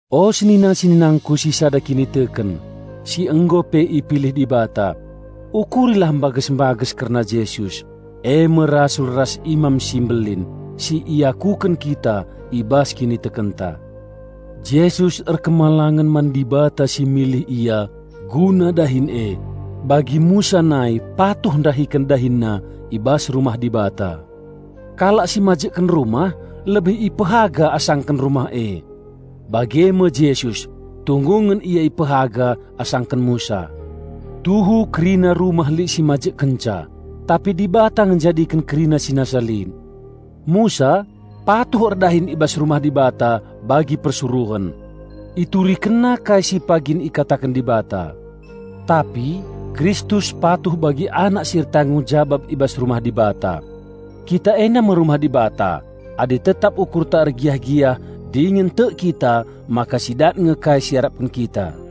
O senina-seninangku si sada kiniteken, si nggo pe ipilih Dibata! Ukurilah mbages-mbages kerna Jesus, e me Rasul ras Imam si Mbelin, si iakuken kita i bas kinitekenta. Jesus patuh man Dibata si milih Ia guna dahin e, bagi Musa nai patuh ndahiken dahinna i bas rumah Dibata. Kalak si majekken rumah lebih ipehaga asangken rumah e. Bage me Jesus, tunggungen Ia ipehaga asangken Musa. Tuhu kerina rumah lit si majekkenca, tapi Dibata nge njadiken kerina si nasa lit. Musa patuh erdahin i bas rumah Dibata bagi persuruhen. Iturikenna kai si pagin ikataken Dibata. Tapi Kristus patuh bagi Anak si ertanggung jabap i bas rumah Dibata. Kita enda me rumah Dibata adi tetap ukurta ergiah-giah dingen tek kita maka sidat nge kai si iarapken kita.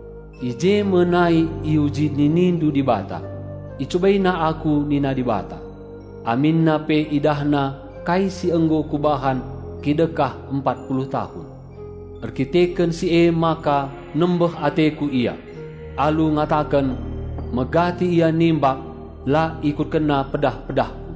I je me nai iuji ninindu Dibata, icubaina Aku nina Dibata, aminna pe idahna kai si nggo Kubahan kidekah empat puluh tahun. Erdandanken si emaka nembeh ateKu ia, alu ngataken, 'Megati ia nimbak, la ikutkenna pedah-pedahKu.'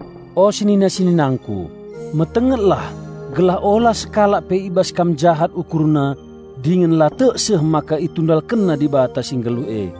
O senina-seninangku, metengetlah gelah ula sekalak pe i bas kam jahat ukurna dingen la tek seh maka itundalkenna Dibata si Nggeluh e!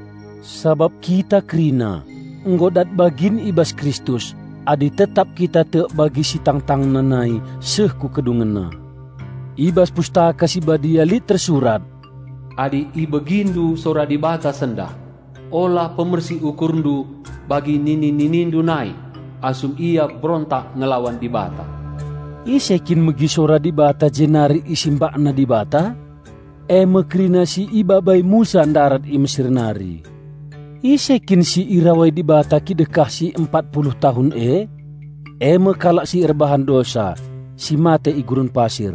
Sabap kita kerina nggo dat bagin i bas Kristus adi tetap kita tek bagi si tangtangna nai seh ku kedungenna. I bas Pustaka Si Badia lit tersurat, "Adi ibegindu sora Dibata sendah, ula pemersik ukurndu bagi nini-ninindu nai asum ia berontak ngelawan Dibata." Ise kin megi sora Dibata jenari isimbakna Dibata? E me kerina si ibabai Musa ndarat i Mesir nari. Ise kin si irawai Dibata kidekah si empat puluh tahun e? E me kalak si erbahan dosa, si mate i gurun pasir.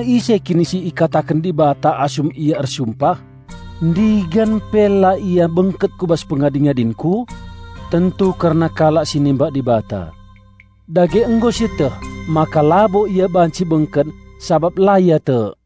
Ise kin kata Dibata asum Ia Ersumpah "Ndigan pe la ia bengket ku bas pengadi-ngadinKu?" Tentu kalak si nimbak Dibata! Dage nggo sieteh maka labo ia banci bengket sabap la ia tek.